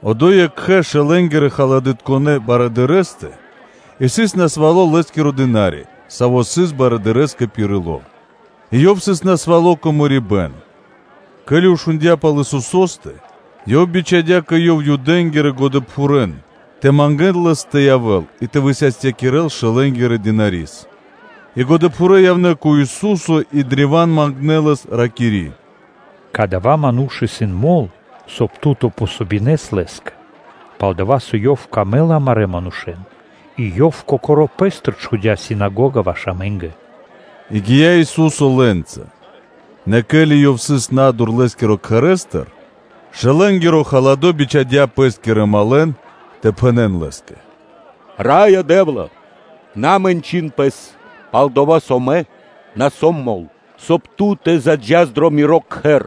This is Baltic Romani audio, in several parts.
Одо́й екхэ шэлэнгирэ-халадытконэ барыдырэстэ сыс насвало́ лэ́скиро дына́ри, саво́ сыс лэ́стэ дрэ паты́в, и ёв сыс насвало́ кэ мэрибэ́н. Ке́ли барыдыро́ шундя́ пал Исусо́стэ, ёв бичхадя́ кэ Ёв Юдэ́нгирэ годэпхурэн тэ мангэ́н Лэс тэ явэ́л, и тэ высастякирэл шэлэнгирэ дынари́с. И годэпхурэ́ явнэ́ кэ Ису́со и древа́н мангнэ́ Лэс, ракири́: “Кадава́ ману́ш исын мол, соб (кай) Ту тэ помогинэс Лэ́скэ. Пал-дова́ со лэ́скэ исын дро́га амарэ́ мануша́ и ёв чхудя́ синагога ваш амэ́нгэ.” И гия́ Ису́со лэ́нца; нэ, ке́ли Ёв сыс на́дур лэ́скирэ кхэрэ́стыр, то бичхадя́ пэ́скирэ малэн тэ пхэнэ́н Лэ́скэ: “Раё Дэ́вла! На мэнчын Пэс; пал-дова́ со мэ на сом мол, соб (кай) Ту тэ заджас дро Миро кхэр;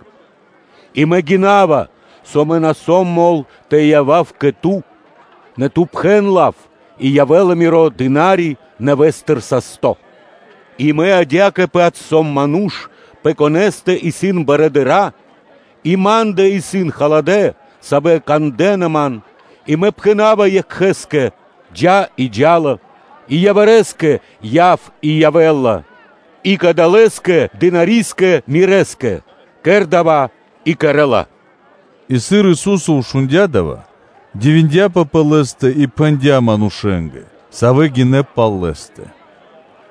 и мэ гинава, со мэ на сом мол тэ явав кэ Ту; нэ Ту пхэн лав, и явэ́ла миро дына́ри нэвэ́стыр састо́. И мэ адя́кэ-паць сом ману́ш, пэ конэ́стэ исын барыдыро́, и ма́ндэ исын халадэ́, савэ́ кандэ́на ман, и мэ пхэна́ва екхэ́скэ: ‘Джа́’ и джа́ла; и явирэскэ: ‘Яв’ и явэ́ла, и кадалэскэ дынари́скэ мирэ́скэ: ‘Кэр дава́,’ и кэрэ́ла.” И сыр Ису́со шундя́ дава́, дивиндяпэ лэ́стыр и пхэндя́ манушэ́нгэ, савэ́ гинэ́ пал Лэ́стэ: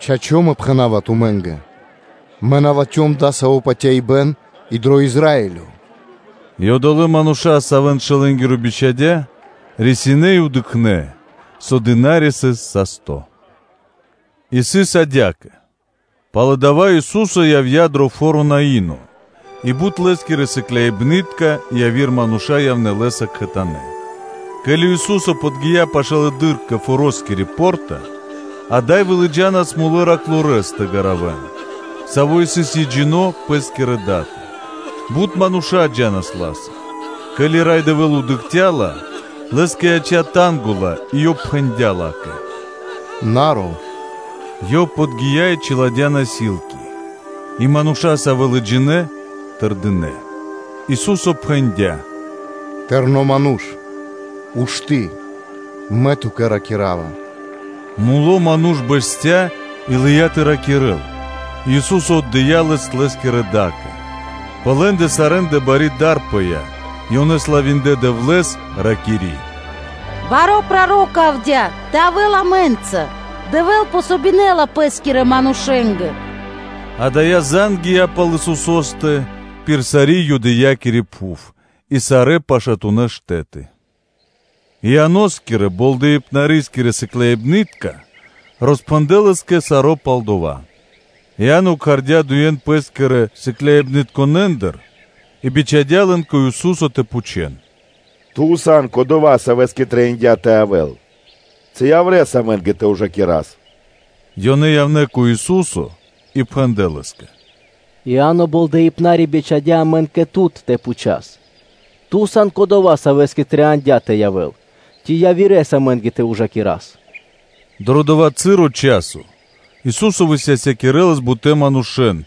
“Чачо́, Мэ пхэна́ва тумэ́нгэ: Мэ на латхём дасаво патяибэ́н и дро Израилё.” И одолэ́ мануша́, савэ́н барыдыро́ шэлэнгиро бичхадя́, рисинэ́ и дыкхнэ́, со дына́ри сыс састо́. И сыс адя́кэ: пало́ дава́ Ису́со явдя́ дро фо́ро Наино и бут Лэ́скирэ сыкляибны́тка и яви́р мануша́ явнэ́ Лэ́са кхэтанэ́. Ке́ли Ису́со подги́я пашылэды́р кэ форо́скири по́рта, ада́й вылыджанас мулэ́ манушэ́с тэ гаравэн, саво́ сыс екхджино́ пэ́скирэ датэ; бут мануша́ джа́нас ла́са. Ке́ли Рай Дэвэ́л дыкхця́ ла, Лэ́скэ яця́ танго (жалко) ла и Ёв пхэндя́ ла́кэ: “На ров” И Ёв подги́я и чиладя́ насилки (трага́чы), и мануша́, савэ́ лыджинэ́, тэрдинэ́. Ису́со пхэндя́: “Тэрно́ ману́ш, ушты́, Мэ ту́кэ ракира́ва.” Муло ману́ш бэсця́ и лыя́ тэ ракирэ́л; и Ису́со отдыя́ лэс лэ́скирэ да́кэ. Пэ лэ́ндэ сарэ́ндэ бари дар пыя́ и ёнэ славиндлэ Дэвлэ́с, ракири́: “Баро́ проро́ко явдя́ тэ явэ́л амэ́нца, Дэвэ́л помогинэла Пэ́скирэ манушэ́нгэ.” Адая зан (звесь) гия́ пал Исусо́стэ пир сари́ Юдеякири пхув и сарэ́ пашатунэ́ штэ́ты. И Ианоскирэ Болдэипнарискирэ сыкляибны́тка роспхэндлэ́ лэ́скэ саро́ пал дова́. Иа́но кхардя́ дуе́н пэ́скирэ сыкляибнытконэндыр и бичхадя́ лэн кэ Ису́со тэ пхучэ́н: “Ту сан Кодова́, Савэ́скэ трэй тэ явэ́л, ци явирэ́с амэ́нгэ тэ ужакирас?” Ёнэ явнэ́ кэ Ису́со и пхэндлэ́ Лэ́скэ: “Иа́но Болдэипнари бичхадя́ амэн кэ ту тэ пхучас: ‘Ту сан Кодова́, Савэ́скэ трэиндя́ тэ явэ́л, ци явирэ́с амэ́нгэ тэ ужакирас?’” Дро дова́ часо Ису́со высастякирэлас бутэ́ манушэ́н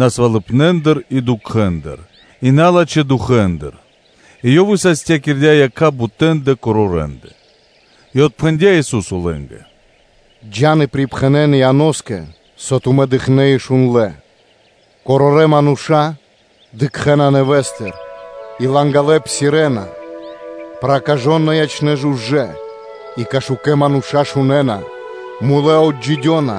насвалыпнэндыр и дукхэндыр и налачхэ́ дукхэндыр и Ёв высастякирдя́ якха́ бутэндэ корорэндэ. И отпхэндя́ Ису́со лэ́нгэ: “Джа́н и пирипхэнэн Ианоскэ, со тумэ́ дыкхнэ́ и шундлэ́: корорэ́ мануша́ дыкхэ́на нэвэ́стыр и лангалэ псирэ́на: проказытка ячэ́на жужэ́, и кашукэ мануша́ шунэ́на, мулэ́ отджидёна,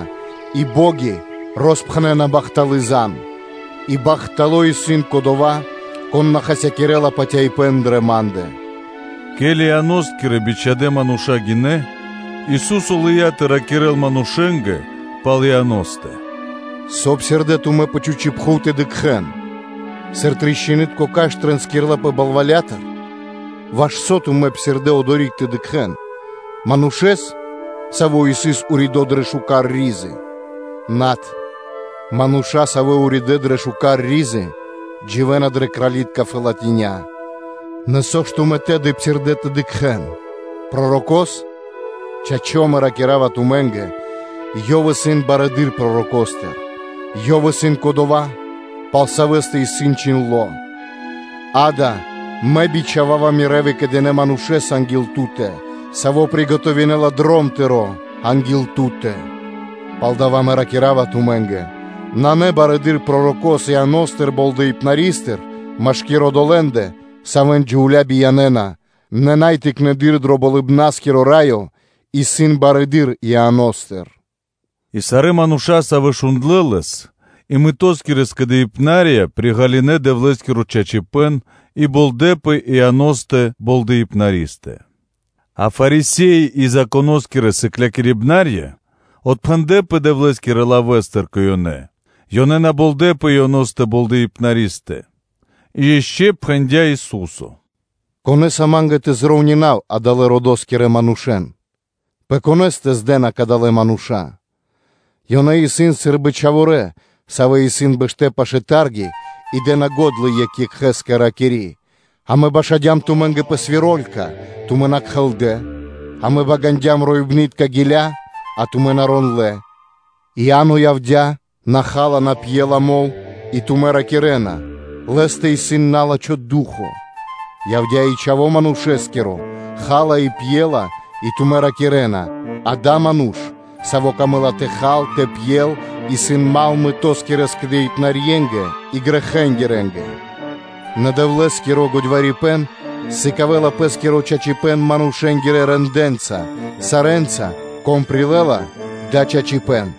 и бо́ги роспхэнэна бахталы́ зан (звесь); и бахтало́ исын кодова́, кон на хасякирэ́ла патяибэ́н дрэ Ма́ндэ.” Ке́ли Ианоскирэ бичхадэ́ мануша́ гинэ́, Ису́со лыя́ тэ ракирэ́л манушэ́нгэ пал Ианостэ: “Со псирдэ́ тумэ́ пэ чхучи́ пхув тэ дыкхэ́н? Сыр трастинитко кашт тринскирлапэ балвалятыр? Ваш со тумэ́ псирдэ́ одори́к тэ дыкхэ́н? Манушэ́с, саво́ сыс уридо́ дрэ шука́р и́дя? Над, мануша́, савэ́ уридэ́ дрэ шука́р и́дя, дживэ́на дрэ кралитка барэ́ фэлатиня́ (колова). Нэ, со ж тумэ́ тэды псирдэ́ тэ дыкхэ́н? Пророко́с? Чачо́, ракира́ва тумэ́нгэ: ‘Ёв исын барэды́р пророкостыр.’ Ёв исын кодова́, пал савэ́стэ исын чхиндло́: “Гада, Мэ бичхава́ва Мирэ́ выкэдынэ́ манушэ́с анги́л Ту́тэ, саво́ приготовинэла дром Тыро́ анги́л Ту́тэ.’” Палдава́ Мэ ракира́ва тумэ́нгэ: нанэ барэды́р пророко́с Иано́стыр Болдэипнаристыр машки́р одолэ́ндэ, савэ́н джувля́ биянэна, нэ най тыкнэды́р дро Болыбна́скиро Раё исын барэды́р Иано́стыр.” И сарэ́ мануша́, савэ́ шундлэ́ Лэс, и мытоскирэ скэдыибнарья приґалынэ Дэвлэ́скиро чачипэ́н и болдэпэ Ианостэ Болдэипнаристэ. А Фарисе́и и Законо́скирэ сыклякирибнарья отпхэндлэпэ Дэвлэ́скирэ лавэ́стыр; ёнэ на болдэпэ Ианостэ Болдэипнаристэ. И ишчо (инкэ́) пхэндя́ Ису́со: “Кэ кон Ма́нгэ тэ припарував (тэ роўнинав) адалэ́-родоскирэ манушэ́н? Пэ конэ́стэ зджана (подджана) кадалэ́ мануша́? Ёнэ исын сы́рбы чхаворэ́, савэ́ исын бэштэ́ пашы́л тарги и дэ́на го́дла екх екхэ́скэ, ракири́: “Амэ башадям тумэ́нгэ пэ свиролька, а тумэ́ на кхэлдэ; амэ багандям роибнытка гиля́, а тумэ́ на рондлэ́.” И Иа́но явдя́, на ха́ла, на пьела мол (вино), и тумэ́ ракирэ́на: “Лэ́стэ исын на́лачхо ду́хо (фа́но).” Явдя́ и Чхаво́ Манушэ́скиро, ха́ла, и пьела, и тумэ́ ракирэ́на: “Гада, ману́ш, саво́ камэ́ла тэ хал, тэ пьел, исын дру́го (мал) мытоскирэ скэдыибнарьенгэ и грэхэнгирэнгэ’. Нэ Дэвлэ́скиро годьварипэн сыкавэ́ла Пэ́скиро чачипэ́н манушэ́нгирэ рэндэ́нца (делэнца), сарэ́нца, кон прилэ́ла дава́ чачипэ́н.”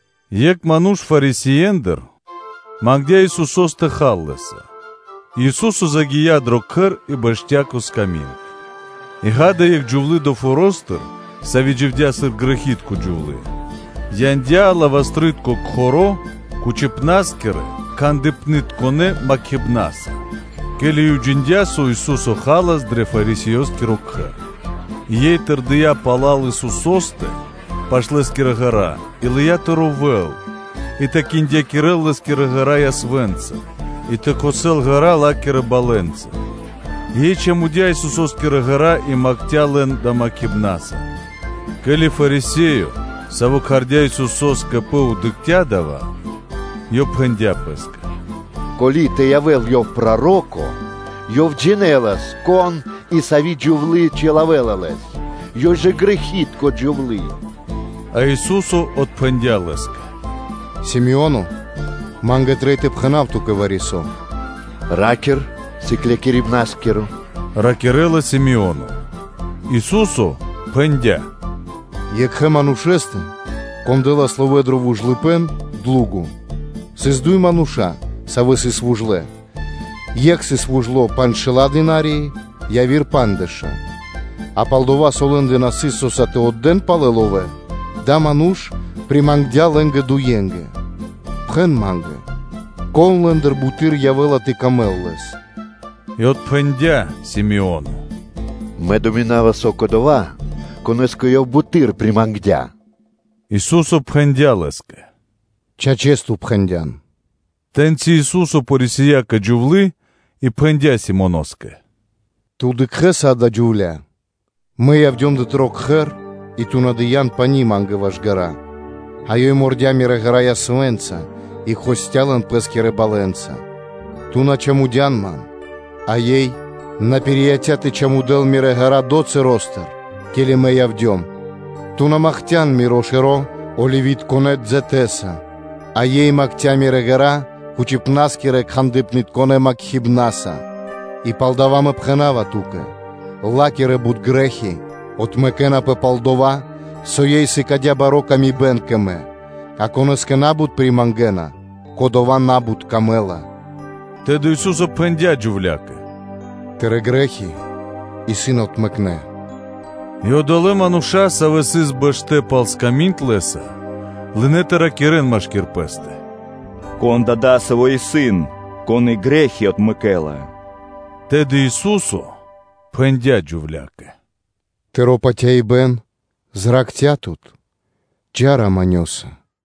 Екх ману́ш Фарисеендыр мангдя́ Исусо́с тэ хал Лэ́са; и Ису́со загия́ дро кхэр и бэсця́ кэ сками́нд: и, ґа́да, екх джувлы́ долэ́ форо́стыр, сави́ дживдя́ сыр грэхи́тко джувлы́, яндя́ алибастрытко кхоро́ (жбанко) кучипнаскирэ – кхандыпнытконэ макхибнаса, ке́ли ёй уджиндя́, со Ису́со халас дро Фарисеёскиро кхэр; и ёй тэрдия́ пала́л пал Исусо́стэ пашы́л Лэ́скирэ ґэра́ и лыя́ тэ ровэл и тэ киндякирэл Лэ́скирэ ґэра́ ясвэ́нца и тэ кхосэл ґэра́ ла́кирэ балэнца; и ёй чамудя Исусо́скирэ ґэра́ и макхця лэн далэ́ макхибнаса. Ке́ли Фарисеё, саво́ кхардя́ Исусо́с кэ пэ, дыкхця́ дава́, ёв пхэндя́ пэ́скэ: “Ко́ли тэ явэ́л Ёв проро́ко, Ёв джинэлас, кон, и сави́ джувлы́ чилавэ́ла Лэс; ёй жа исын грэхи́тко джувлы́.” А Ису́со отпхэндя́ Лэ́скэ: “Си́моно, Ма́нгэ трэй тэ пхэна́в ту́кэ вари-со.” “Ра́кир, Сыклякирибна́скиро”, – раки́рла Си́моне. Ису́со пхэндя́: “Екхэ манушэ́стэ, кон дэ́лас ловэ́ дро вужлыпэ́н (длуго), сыс дуй мануша́, савэ́ сыс вужлэ; екх сыс вужло панджшэла́ динарии, яви́р пандждэша́; а пал-дова́ со лэ́ндэ на сыс со́са тэ отдэ́н палэ ловэ́, дава́ ману́ш примангдя лэ́нгэ дуенгэ. Пхэн ма́нгэ: “Кон лэ́ндыр буты́р явэ́ла тэ сыкавэ́л паты́в лэ́скэ?” И отпхэндя́ Си́моно: “Мэ думинава, со кодова́, конэ́скэ ёв буты́р примангдя.” Ису́со пхэндя́ Лэ́скэ: “Чачэс ту пхэндя́н.” Тэ́ньци Ису́со порисия кэ джувлы́ и пхэндя́ Симоноскэ: “Ту дыкхэ́са адаля джувля́? Мэ явдём дро тыро́ кхэр, и ту на дыя́н пани́ ма́нгэ ваш ґэра́, а ёй мордя Мирэ́ ґэра́ ясвэ́нца и кхосця лэн пэ́скирэ балэнца. Ту на чамудян Ман, а ёй на пирияця́ тэ чамудэл Мирэ́ ґэра́ долэ́ часостыр, ке́ли Мэ явдём. Ту на макхця Миро шэро́ оливитконэ дзэтэса, а ёй макхцян Мирэ́ ґэра́ кучипнаскирэ-кхандыпнытконэ макхибнаса. И палдава́ Мэ пхэна́ва ту́кэ: ла́кирэ бут грэ́хи отмэкэнапэ пал дова́, со ёй сыкадя́ бари ла́ска кэ Мэ; а конэ́скэ на́бут примангэна, кодолэстэ на́бут исын ла́ска.” Тэды Ису́со пхэндя́ джувля́кэ: “Тырэ́ грэ́хи исын отмэкнэ.” И одолэ́ мануша́, савэ́ сыс бэштэ́ пал сками́нд Лэ́са, лынэ́ тэ ракирэ́н машки́р пэ́стэ: “Кон да дасаво исын, Кон и грэ́хи отмэкэ́ла?” Тэды Ису́со пхэндя́ джувля́кэ: “Тыро́ патяибэ́н зракхця́ тут, джа́ раманёса (миро́са).”